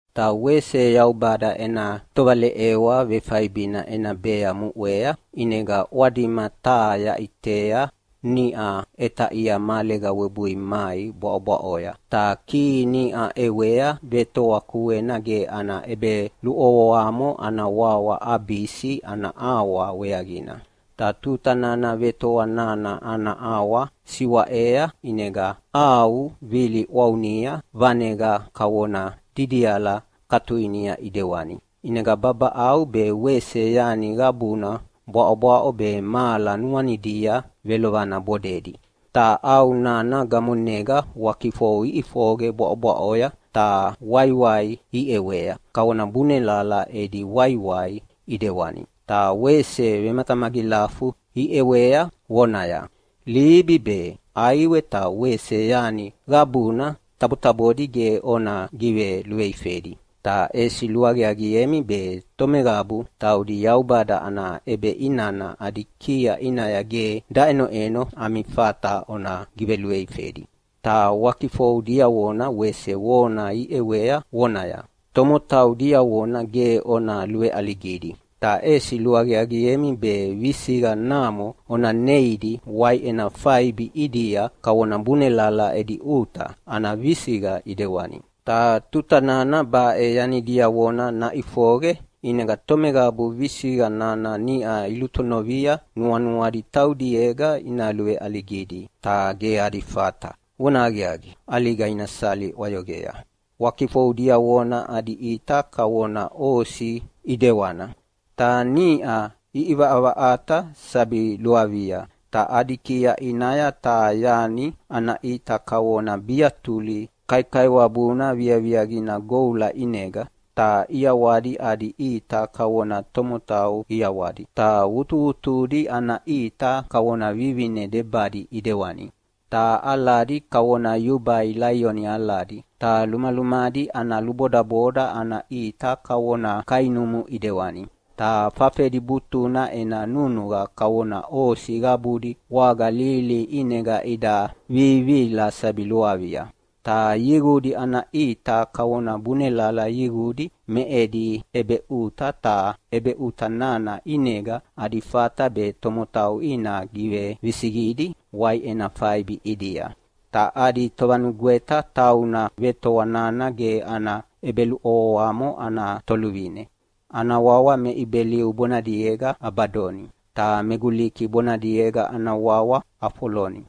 Ta wese Yaubada ena tovaleʼewa vefaibina ena bea muʼea, ʼinega ʼwadima taha yaʼitea niʼa ʼetaʼia mahalega webui mai bwaʼobwaʼoya. Ta kihi niʼa ʼewea vetoa kuena ge ana ʼebeluʼovoamo ana wawa Abisi ana ʼawa weaqina. Ta tuta nana vetoa nana ana ʼawa siwaʼea ʼinega ʼau viliʼwaunia vaneqa kavona didiala katuinia ʼidewani. ʼInega babaʼau be wese yani qabuna bwaʼobwaʼo be mahala nuanidia velovana bodedi. Ta ʼau nana gamonega wakifou iʼifoqe bwaʼobwaʼoya, ta waiwai iʼewea kavona bunelala edi waiwai ʼidewani. Ta wese vematamagilafu iʼewea vonaya, “Libi be, ʼaiwe ta wese yani qabuna tabotabodi ge ona giveluveifedi, ta ʼesi luaqiaqiemi be tomeqabu taudi Yaubada ana ʼebeʼinana adi kia ʼinaya ge daʼenoʼeno ami fata ona giveluveifedi.” Ta wakifou diavona wese vona iʼewea vonaya, “Tomotau diavona ge ona luveʼaligidi, ta ʼesi luaqiaqiemi be visiqa namo ona neidi waiʼena faibi ʼidia kavona bunelala edi ʼuta ana visiqa ʼidewani.” Ta tuta nana baʼe yani diavona naʼifoqe ʼinega tomeqabu visiqa nana niʼa ilulutonovia nuanuadi taudiega ina luveʼaligidi, ta ge adi fata. Vonahaqiaqi, ʼaliga ina sali ʼwayoqea. Wakifou diavona adi ʼita kavona osi ʼidewana, ta niʼa iʼivaʼavaʼata sabi luavia. Ta adi kia ʼinaya taha yani ana ʼita kavona biatuli kaikaiwabuna viaviaqina goula ʼinega. Ta ʼiawadi adi ʼita kavona tomotau ʼiawadi. Ta wutuwutudi ana ʼita kavona vivine debadi ʼidewani, ta aladi kavona yubai laioni aladi. Ta lumalumadi ana lubodaboda ana ʼita kavona kainumu ʼidewani. Ta fafedi butuna ena nunuqa kavona osi qabudi waga lihilihi ʼinega ida vivihila sabi luavia. Ta yiqudi ana ʼita kavona bunelala yiqudi me edi ʼebeʼuta, ta ʼebeʼuta nana ʼinega adi fata be tomotau ina givevisiqidi waiʼena faibi ʼidia. Ta adi tovanugweta tauna vetoa nana ge ana ʼebeluʼovoamo ana toluvine. Ana wawa me Ibeliu bonadiega Abadoni, ta me Guliki bonadiega ana wawa Afoloni,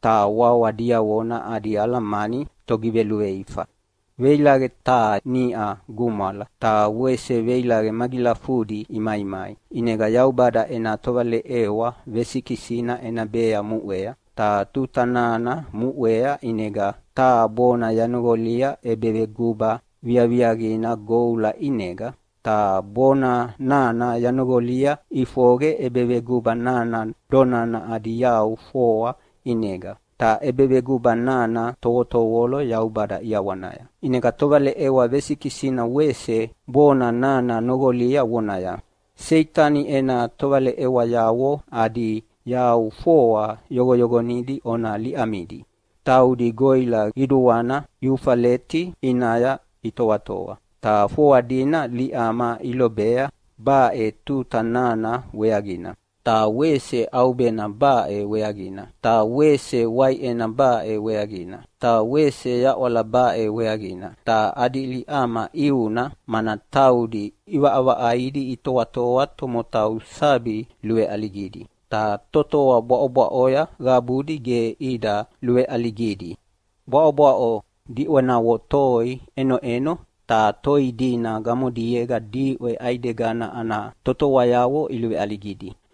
ta wawa diavona adi alamani “Togiveluveifa”. Veilaqe taha niʼa gumwala, ta wese veilaqe magilafudi imaimai. ʼInega Yaubada ena tovaleʼewa vesikisina ena bea muʼea. Ta tuta nana muʼea, ʼinega taha bona yanoqolia ʼebeveguba viaviaqina goula ʼinega. Ta bona nana yanoqolia ʼifoqe ʼebeveguba nana donana adi yau foa ʼinega, ta ʼebeveguba nana tovotovolo Yaubada ʼiawanaya. ʼInega tovaleʼewa vesikisina wese bona nana noqolia vonaya, “Seitani ena tovaleʼewayavo adi yau foa yoqoyoqonidi una liʼamidi. Taudi goʼila qiduana Eufaleti ʼinaya itoatoa.” Ta foa dina liʼama ilobea baʼe tuta nana weaqina, ta wese ʼaubena baʼe weaqina, ta wese waiʼena baʼe weaqina, ta wese yaʼwala baʼe weaqina. Ta adi liʼama ʼiuna, mana taudi ʼivaʼavaʼaidi itoatoa tomotau sabi luveʼaligidi. Ta totoa bwaʼobwaʼoya qabudi ge ida luveʼaligidi. Bwaʼobwaʼo diʼwenavo toi ʼenoʼeno, ta toi dina gamodiega diʼwe ʼaidegana ana totoayavo iluveʼaligidi.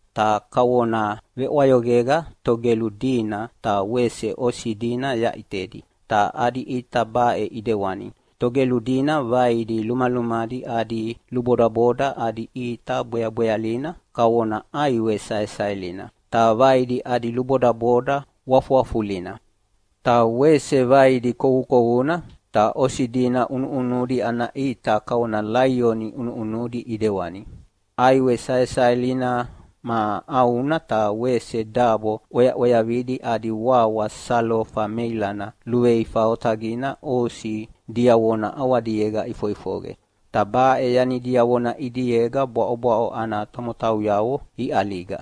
Ta kavona veʼwayoqega togelu dina ta wese osi dina yaʼitedi, ta adi ʼita baʼe ʼidewani: Togelu dina vaidi lumalumadi adi lubodaboda adi ʼita bweabwealina kavona ʼaiwe saesaelina, ta vaidi adi lubodaboda wafuwafulina, ta wese vaidi kowukowuna. Ta osi dina ʼunuʼunudi ana ʼita kavona laioni ʼunuʼunudi ʼidewani. ʼAiwe saesaelina ma ʼauna ta wese dabo ʼweaʼweavidi adi wawa salofa meilana luveifa otaqina osi diavona ʼawadiega ʼifoʼifoqe. Ta baʼe yani diavona ʼidiega bwaʼobwaʼo ana tomotauyavo iʼaliga.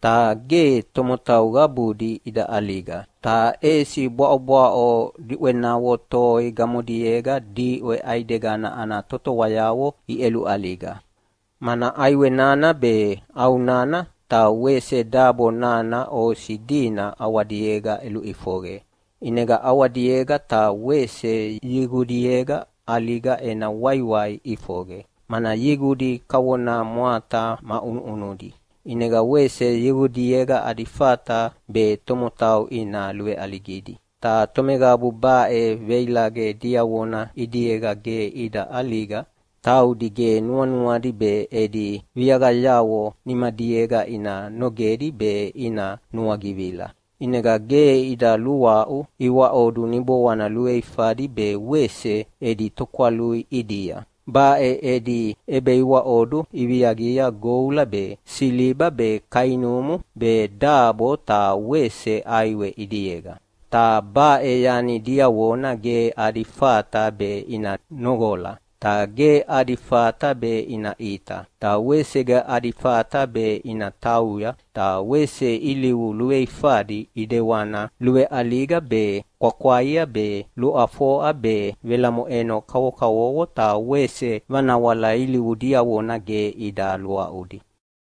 Ta ge tomotau qabudi ida ʼaliga, ta ʼesi bwaʼobwaʼo diʼwenavo toi gamodiega diʼwe ʼaidegana ana totoayavo iʼeluʼaliga, mana ʼaiwe nana be, ʼau nana ta wese dabo nana osi dina ʼawadiega ʼeluʼifoqe. ʼInega ʼawadiega ta wese yiqudiega ʼaliga ena waiwai ʼifoqe, mana yiqudi kavona mwata ma ʼunuʼunudi, ʼinega wese yiqudiega adi fata be tomotau ina luveʼaligidi. Ta tomeqabu baʼe veilaqe diavona ʼidiega ge ida ʼaliga taudi ge nuanuadi be edi viaqayavo nimadiega ina nogedi be ina nuagivila. ʼInega ge ida luaʼu iwaʼodu niboana luveifadi be wese edi tokwalui ʼidia. Baʼe edi ʼebeiwaʼodu iviaqia goula be, siliba be, kainumu be, dabo ta wese ʼaiwe ʼidiega, ta baʼe yani diavona ge adi fata be ina noqola, ta ge adi fata be ina ʼita, ta wese ge adi fata be ina tauya. Ta wese ilivu luveifadi ʼidewana luveʼaliga be, kwakwaia be, luʼafoʼa be, velamoʼeno kavokavovo ta wese vanawala ilivu diavona ge ida luaʼudi.